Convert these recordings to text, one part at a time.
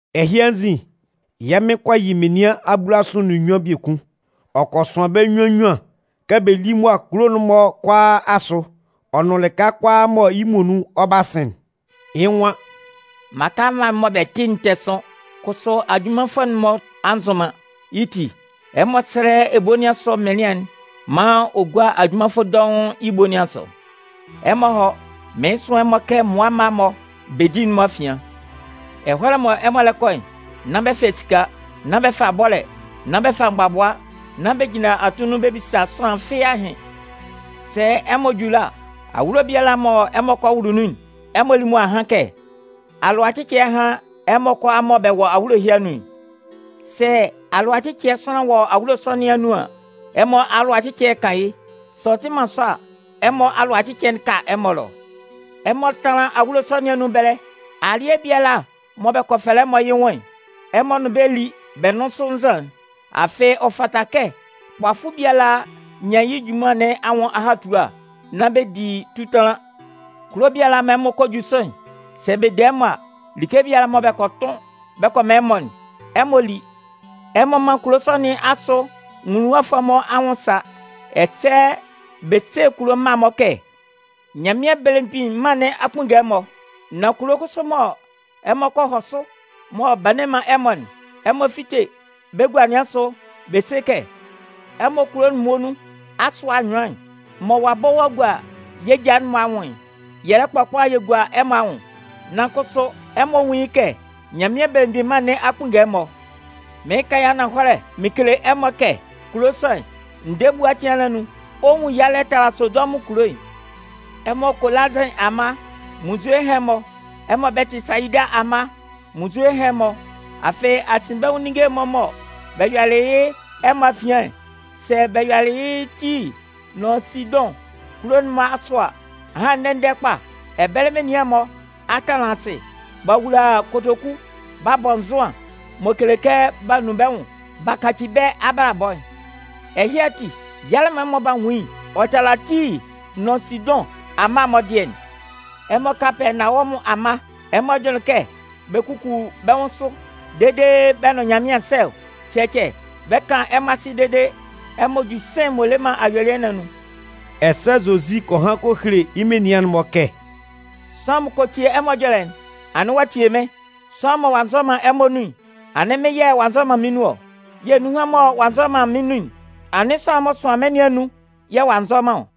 Ɛhɩ anzin, yɛ́ Mɩn kɔ yɩ menian abulasʋ nʋn nnyuan biekun. Ɔ kɔ sʋan bɛ́ nnyuan nnyuan kɛ bɛ lí mʋa kulo'n-mɔ kʋalaa asʋ ɔ nʋn lɩka kʋalaa mɔ yɩ́ muonun ɔ 'ba sɩn'n. Yɩ́ nwan: “Mmaka mma'n mɔ bɛ 'tɩ'n tɛ sʋn, kʋsʋ ajunmanfʋ'n-mɔ a nzʋn man. Yɩ́ ti, ɛmɔ sɛ́lɛ ebo nɩn asʋ mɩnlɩan'n maan ɔ gúa ajunmanfʋ dɔʋn yɩ́ ebo nɩn asʋ. Ɛmɔ hɔ́! Mɩɩn sʋan ɛmɔ kɛ mmʋa mma-mɔ bedi'n-mɔ afian. Ɛhɔlɛ mɔ ɛmɔ lɛ kɔ'n, nán bɛ fa esika, nán bɛ fa bɔ́lɛ, nán bɛ fa mgbabʋa, nán bɛ jinlan atunnun bɛ bisa sʋanlan fɩ́ɩ́ ahɩn. “Sɛ ɛmɔ ju ɛlɔ a, awulo biala mɔ ɛmɔ kɔ wʋlʋ nun'n, ɛmɔ lí mʋa hán kɛ: ‘Alʋacɩcɩɛ hán ɛmɔ kʋalaa mɔ bɛ wɔ awulo ɛhɩ anun'n.’ Sɛ alʋacɩcɩɛ sʋanlan wɔ awulo sɔ nɩn anun an, ɛmɔ alʋacɩcɩɛ'n 'kan yɩ́. Sɛ ɔ tɩ man sɔ a, ɛmɔ alʋacɩcɩɛ'n 'ka ɛmɔ ɛlɔ. Ɛmɔ tánlan awulo sɔ nɩn anun ɛbɛlɛ. Alɩɛ biala mɔ bɛ kɔ fɛlɛ ɛmɔ yɩ́ nwʋn'n, ɛmɔ nʋn bɛ́ lí bɛ nʋ́n sʋ nzan'n. Afɩ ɔ fata kɛ kpafʋ biala nyan yɩ́ junman nɩn anwʋn ahatua. Nán bɛ di tutanlan. “Kulo biala mɔ ɛmɔ kɔ ju sʋ'n, sɛ bɛ de ɛmɔ a, like biala mɔ bɛ kɔ tʋn bɛ kɔ man ɛmɔ'n, ɛmɔ lí. Ɛmɔ mán kulo sɔ nɩn asʋ nwuluwafʋɛ'n-mɔ anwʋn sa, ɛsɛ bɛ sé kulo mma'n-mɔ kɛ: ‘Nyanmɩan Belemgbin Mân nɩn a kpunnge ɛmɔ.’ Nan kulo kʋsʋ mɔ ɛmɔ kɔ hɔ sʋ mɔ b'a nne man ɛmɔ'n, ɛmɔ fíte bɛ́ gua nɩn asʋ, bɛ sé kɛ: ‘Ɛmɔ kulo'n muonun asʋ anyʋan'n mɔ ɔ'a bɔ ɔ'a gua yɛ́ ja'n-mɔ anwʋn'n, yɛ lɛ kpɔkpala yɛ gua ɛmɔ anwʋn. Nan kʋsʋ, ɛmɔ nwún yɩ́ kɛ Nyanmɩan Belemgbin Mân nɩn a kpunnge ɛmɔ.’ Mɩɩn kan yɩ́ ananhɔlɛ mɩn kele ɛmɔ kɛ kulo sɔ'n, ndɛɛ ebua cɩan nɩn anun, ɔ 'nwun yalɛ tala Sodɔmʋn kulo'n.” “Ɛmɔ Kolazɩn amma, munnzue hán ɛmɔ! Ɛmɔ Bɛtɩsayida amma, munnzue hán ɛmɔ! Afɩ asinbɛnwʋn ninnge'n-mɔ mɔ bɛ yɔlɩ yɩ́ ɛmɔ afian'n, sɛ bɛ yɔlɩ yɩ́ Tii nʋn Sidʋn kulo'n-mɔ asʋ a, ahan ndɛ-ndɛ kpa, ɛbɛlɛ menian'n-mɔ a tanlan asɩ, b'a wula kotoku b'a bɔ nzʋan m'ɔ kele kɛ b'a nun bɛ́ nwʋn b'a kaci bɛ́ abalabɔ'n. Ɛhɩ ati, yalɛ mɔ ɛmɔ 'ba nwun yɩ́'n, ɔ 'tala Tii nʋn Sidʋn amma'n-mɔ dɩɛ'n. Ɛmɔ Kapɛɛnawɔmʋn amma, ɛmɔ jʋnlɩn kɛ bɛ 'kuku bɛ́ nwʋn sʋ dede bɛ́ nʋn Nyanmɩan sɛ ɔ? Cɛcɛ. Bɛ 'kan ɛmɔ asɩ dede ɛmɔ ju sɩ̂n m'ɔ le man ayuelɩɛ nɩn anun.” Ɛsɛ Zozi kɔ han kɔ hele yɩ́ menian'n-mɔ kɛ: “Sʋanlan m'ɔ kɔ tie ɛmɔ ɛjɔlɛ'n, anɩn ɔ'a tie mɩ́n. Sʋanlan mɔ ɔ'a nzɔ man ɛmɔ nun'n, anɩn mɩ́n yɛ̂ ɔ'a nzɔ man mɩ́n nun ɔ. Yɛ̂ nunhan mɔ ɔ'a nzɔ man mɩ́n nun'n, anɩn sʋanlan'n m'ɔ sʋanlɩn mɩ́n nɩn anun yɛ̂ ɔ'a nzɔ man ɔ.”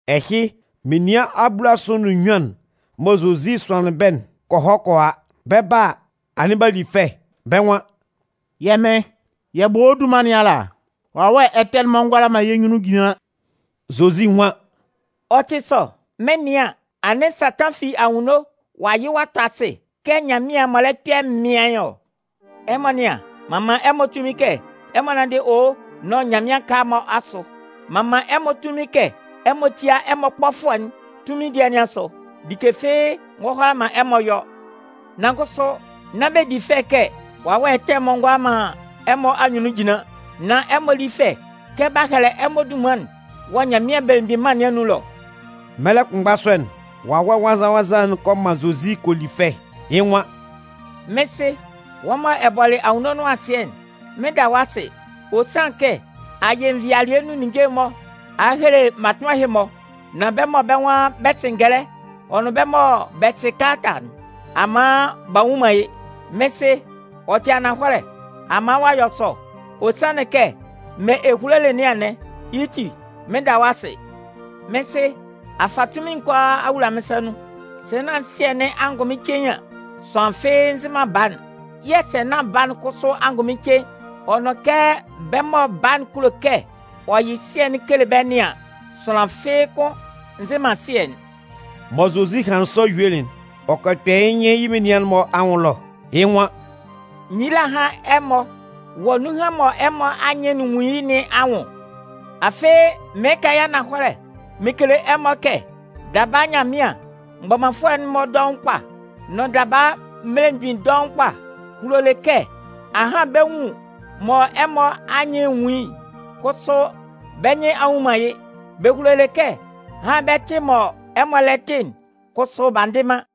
Ɛhɩ, menian abulasʋ nʋn nnyuan'n mɔ Zozi sʋanlɩn bɛ́'n kɔ hɔ kɔ a. Bɛ 'ba a, anɩn b'a li fɛ. Bɛ́ nwan: “Yɛ́ Mɩn, yɛ bɔ wɔ́ dunman nɩn ala, wawɛ ɛtɛ'n-mɔ ngʋala man yɛ́ nyunnun jinlan!” Zozi nwan: “Ɔ tɩ sɔ. Mɩn 'nɩan an, anɩn Satan fi anwunno ɔ'a yɩ ɔ'a tɔ asɩ kɛ nyanmɩan'n m'ɔ lɛ kpɛ mɩaɩn ɔ. Ɛmɔ nɩ́an, m'an man ɛmɔ tunmin kɛ ɛmɔ nánndɩ owo nʋn nyanmɩan aka'n-mɔ asʋ, m'an man ɛmɔ tunmin kɛ ɛmɔ tía ɛmɔ kpɔfʋɛ'n tunmin dɩɛ nɩn asʋ. Like fɩ́ɩ́ ngɔ hʋala man ɛmɔ yɔ. Nan kʋsʋ nán bɛ di fɛ kɛ wawɛ ɛtɛ'n-mɔ ngʋala man ɛmɔ anyunnun jinlan, nan ɛmɔ lí fɛ kɛ b'a hɛlɛ ɛmɔ dunman'n wɔ Nyanmɩan Belemgbin Mân nɩn anun ɛlɔ.” Mɛlɛ kʋnmgba sɔ'n, Wawɛ Nwannzan-nwannzan'n kɔ man Zozi kɔ li fɛ. Yɩ́ nwan: “Mɩ́n Sɩ, wɔ́ mɔ ɛ bɔlɩ anwunno nʋn asɩɛ'n, mɩn 'da wɔ́ asɩ. Ɔ sanlɩn kɛ a yɩ nvɩalɩɛ nun ninnge'n-mɔ a hele mmatʋnman ɛhɩ-mɔ. Nan bɛ́ mɔ bɛ́ nwan bɛ sɩ ngɛlɛ ɔ nʋn bɛ́ mɔ bɛ sɩ kalata'n, a man b'a nnwun man yɩ́. Mɩ́n Sɩ, ɔ tɩ ananhɔlɛ, a man ɔ'a yɔ sɔ. Ɔ sanlɩn kɛ mɔ ɛ hulolɩ nɩn anɩn. Yɩ́ ti, mɩn da wɔ́ asɩ. Mɩ́n Sɩ, a fa tunmin'n kʋalaa a wula mɩ́n sa nun. Sɛ nán Sɩɛ nɩn angʋnmɩn cein an, sʋanlan fɩ́ɩ́ nzɩ man Baa'n. Yɛ̂ sɛ nán Baa'n kʋsʋ angʋnmɩn cein, ɔ nʋn kɛ bɛ́ mɔ Baa'n kulo kɛ ɔ yɩ Sɩɛ'n kele bɛ́ nɩn an, sʋanlan fɩ́ɩ́ kʋn nzɩ man Sɩɛ'n.” Mɔ Zozi hanlɩn sɔ yuelɩ'n, ɔ kɔ kpɛ yɩ́ nyɩn yɩ́ menian'n-mɔ anwʋn ɛlɔ. Yɩ́ nwan: “Nyila hán ɛmɔ wɔ nunhan mɔ ɛmɔ anyɩn'n nwun yɩ́ nɩn anwʋn! Afɩ mɩɩn kan yɩ́ ananhɔlɛ mɩn kele ɛmɔ kɛ daba Nyanmɩan mgbɔmanfʋɛ'n-mɔ dɔʋn kpa, nʋn daba mmelemgbin dɔʋn kpa hulolɩ kɛ ahan bɛ nwun mɔ ɛmɔ anyɩn nwun yɩ́'n, kʋsʋ bɛ́ nyɩn a nnwun man yɩ́. Bɛ hulolɩ kɛ ahan bɛ tɩ mɔ ɛmɔ lɛ tɩ'n, kʋsʋ b'a ndɩ man.”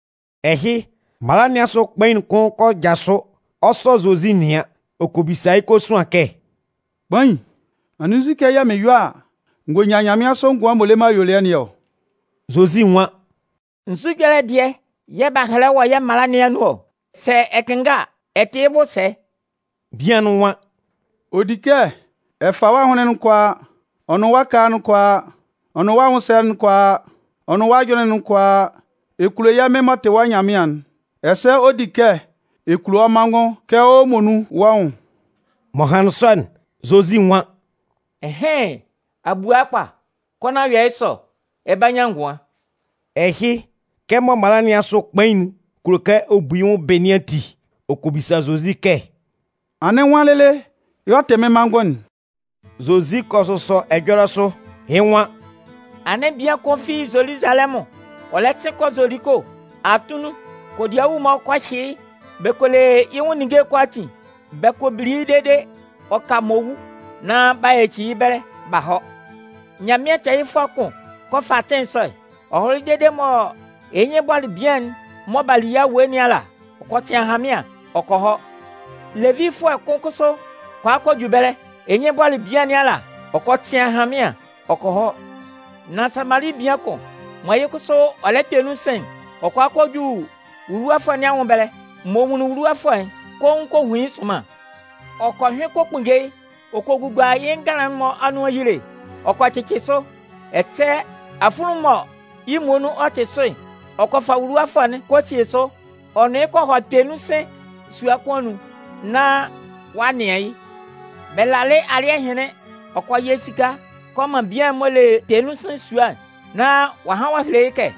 Ɛhɩ, mala nɩn asʋ kpain'n kʋn kɔ jasʋ, ɔ 'sɔ Zozi nɩan. Ɔ kɔ bisa yɩ́ kosuan kɛ: “Kpain, anɩn nzukɛ yɛ̂ mɩn yɔ a, n gɔ nyan nyanmɩansʋ ngʋan'n m'ɔ le man ayuelɩɛ nɩn ɔ?” Zozi nwan: “Nzu ɛjɔlɛ dɩɛ yɛ̂ b'a hɛlɛ wɔ yɛ́ mala nɩn anun ɔ? Sɛ ɛ kɩnnga a, ɛ tɩ yɩ́ bʋ sɛ?” Bian'n nwan: “Ɔ di kɛ ɛ fa wɔ́ ahʋnlɩn'n kʋalaa, ɔ nʋn wɔ́ ɛkala'n kʋalaa, ɔ nʋn wɔ́ anwʋnsɛlɛ'n kʋalaa, ɔ nʋn wɔ́ ajʋnlɩn'n kʋalaa, ɛ kulo yɛ́ Mɩn m'ɔ tɩ wɔ́ Nyanmɩan'n. Ɛsɛ ɔ di kɛ ɛ kulo wɔ́ manngʋn kɛ wɔ́ muonun wɔ́ nwʋn.” M'ɔ hanlɩn sɔ'n, Zozi nwan: “Ɩnhɩn, a bua yɩ́ kpa. Kɔ nán yɔ yɩ́ sɔ, ɛ 'ba nyan ngʋan.” Ɛhɩ, kɛmɔ mala nɩn asʋ kpain'n kulo kɛ ɔ bu yɩ́ nwʋn bɩ nɩn ati, ɔ kɔ bisa Zozi kɛ: “Anɩn nwan lɩlɩ yɛ̂ ɔ tɩ mɩ́n manngʋn'n?” Zozi kɔ sʋsɔ ɛjɔlɛ sʋ, yɩ́ nwan: “Anɩn bian kʋn fi Zoluzalɛmʋn, ɔ lɛ sɩn kɔ Zoliko. Atunnun, kodiawu-mɔ kɔ hyɩ yɩ́, bɛ kɔ le yɩ́ nwʋn ninnge'n kʋalaatin, bɛ kɔ bili yɩ́ dede ɔ ka m'ɔ wu, nán b'a yaci yɩ́ ɛbɛlɛ b'a hɔ. Nyanmɩan tɛɛyɩfʋɛ kʋn kɔ fa atɩn sɔ'n. Ɔ hɔlɩ dede mɔ yɩ́ nyɩn bɔlɩ bian'n mɔ b'a li yɩ́ awue nɩn ala a, ɔ kɔ sɩn ahanmɩan, yɛ̂ ɔ kɔ hɔ. Levifʋɛ kʋn kʋsʋ kɔ a kɔ ju ɛbɛlɛ, yɩ́ nyɩn bɔlɩ bian nɩn ala a, ɔ kɔ sɩn ahanmɩan, yɛ̂ ɔ kɔ hɔ. Nan Samali bian kʋn, mɔ yɩ́ kʋsʋ ɔ lɛ kpɛ nun sɩn'n, ɔ kɔ a kɔ ju wuluwafʋɛ nɩn anwʋn ɛbɛlɛ. M'ɔ nwunlin wuluwafʋɛ'n, koun kɔ hun yɩ́ sʋnman. Ɔ kɔ hyʋɩn kɔ kpunnge yɩ́, ɔ kɔ gugua yɩ́ nganlan'n-mɔ anun ayile, ɔ kɔ cɩcɩ sʋ. Ɛsɛ afunlunmun'n mɔ yɩ́ muonun ɔ tɩ sʋ'n, ɔ kɔ fa wuluwafʋɛ'n kɔ síe sʋ, ɔ nʋn yɩ́ kɔ hɔ kpɛnunsɩn sua kʋn anun, nán ɔ'a nɩan yɩ́. Bɛ lalɩ alɩ́ɛ hɩnlɩn, ɔ kɔ yɩ esika kɔ man bian'n m'ɔ le kpɛnunsɩn sua'n, nán ɔ'a han ɔ'a hele yɩ́ kɛ: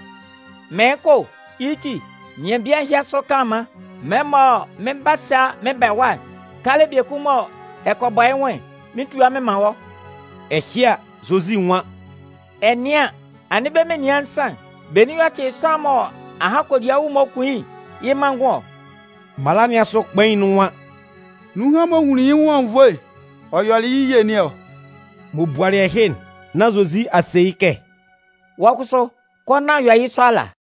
‘Mɩɩn kɔ o, yɩ́ ti, nɩan bian ɛhɩ asʋ kanlanman. Mɛlɛ mɔ mɩn 'ba sa mɩn ba ɛwa'n, kalɛ biekun mɔ ɛ kɔ bɔ yɩ́ nwʋn'n, mɩn 'tua mɩn man wɔ́.’” Ɛhɩ a, Zozi nwan: “Ɛ nɩan an, anɩn bɛ́ menian nsan'n, benin y'ɔ tɩ sʋanlan'n mɔ ahan kodiawu'n-mɔ kun yɩ́'n, yɩ́ manngʋn ɔ?” Mala nɩn asʋ kpain'n nwan: “Nunhan m'ɔ nwunlin yɩ́ nwʋn anwunnvoe ɔ yɔlɛ yɩ́ ye nɩn ɔ.” M'ɔ bualɩ ɛhɩ'n, nán Zozi a se yɩ́ kɛ: “Wɔ́ kʋsʋ, kɔ nán yɔ yɩ́ sɔ ala.”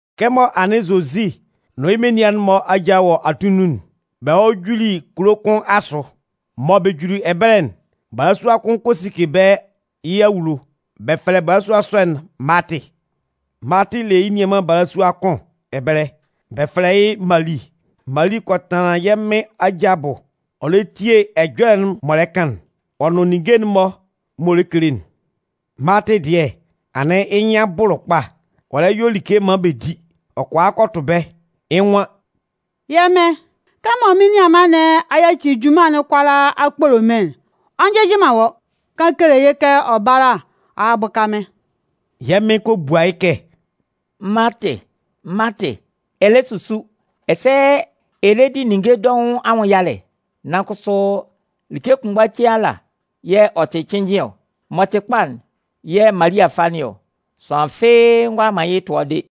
Kɛmɔ anɩn Zozi nʋn yɩ́ menian'n-mɔ aja wɔ atunnun'n, bɛ hɔlɩ juli kulo kʋn asʋ. Mɔ bɛ juli ɛbɛlɛ'n, balasua kʋn kɔ sike bɛ́ yɩ́ awulo. Bɛ fɛlɛ balasua sɔ'n Maatɩ. Maatɩ le yɩ́ nianman balasua kʋn ɛbɛlɛ, bɛ fɛlɛ yɩ́ Mali. Malɩ kɔ tanlan yɛ́ Mɩn aja abʋ, ɔ lɛ tie ɛjɔlɛ'n m'ɔ lɛ kan'n, ɔ nʋn ninnge'n-mɔ m'ɔ lɛ kele'n. Maatɩ dɩɛ, anɩn yɩ́ nyɩn a bʋlʋ kpa, ɔ lɛ yɔ like maan bɛ di. Ɔ kɔ a kɔ tʋ bɛ́. Yɩ́ nwan: “Yɛ́ Mɩn, kɛmɔ mɩ́n nianman nɩn a yaci junman'n kʋalaa a kpolo mɩ́n'n, ɔ njɩjɩ man wɔ́ ɔ? Kan kele yɩ́ kɛ ɔ bála a bʋka mɩ́n.” Yɛ́ Mɩn kɔ bua yɩ́ kɛ: “Maatɩ, Maatɩ, ɛ lɛ susu, ɛsɛ ɛ lɛ di ninnge dɔʋn anwʋn yalɛ. Nan kʋsʋ like kʋnmgban cein ala yɛ̂ ɔ tɩ cɩnnjɩn ɔ. M'ɔ tɩ kpa'n, yɛ̂ Mali a fa nɩn ɔ. Sʋanlan fɩ́ɩ́ ngʋala man yɩ́ tʋa de.”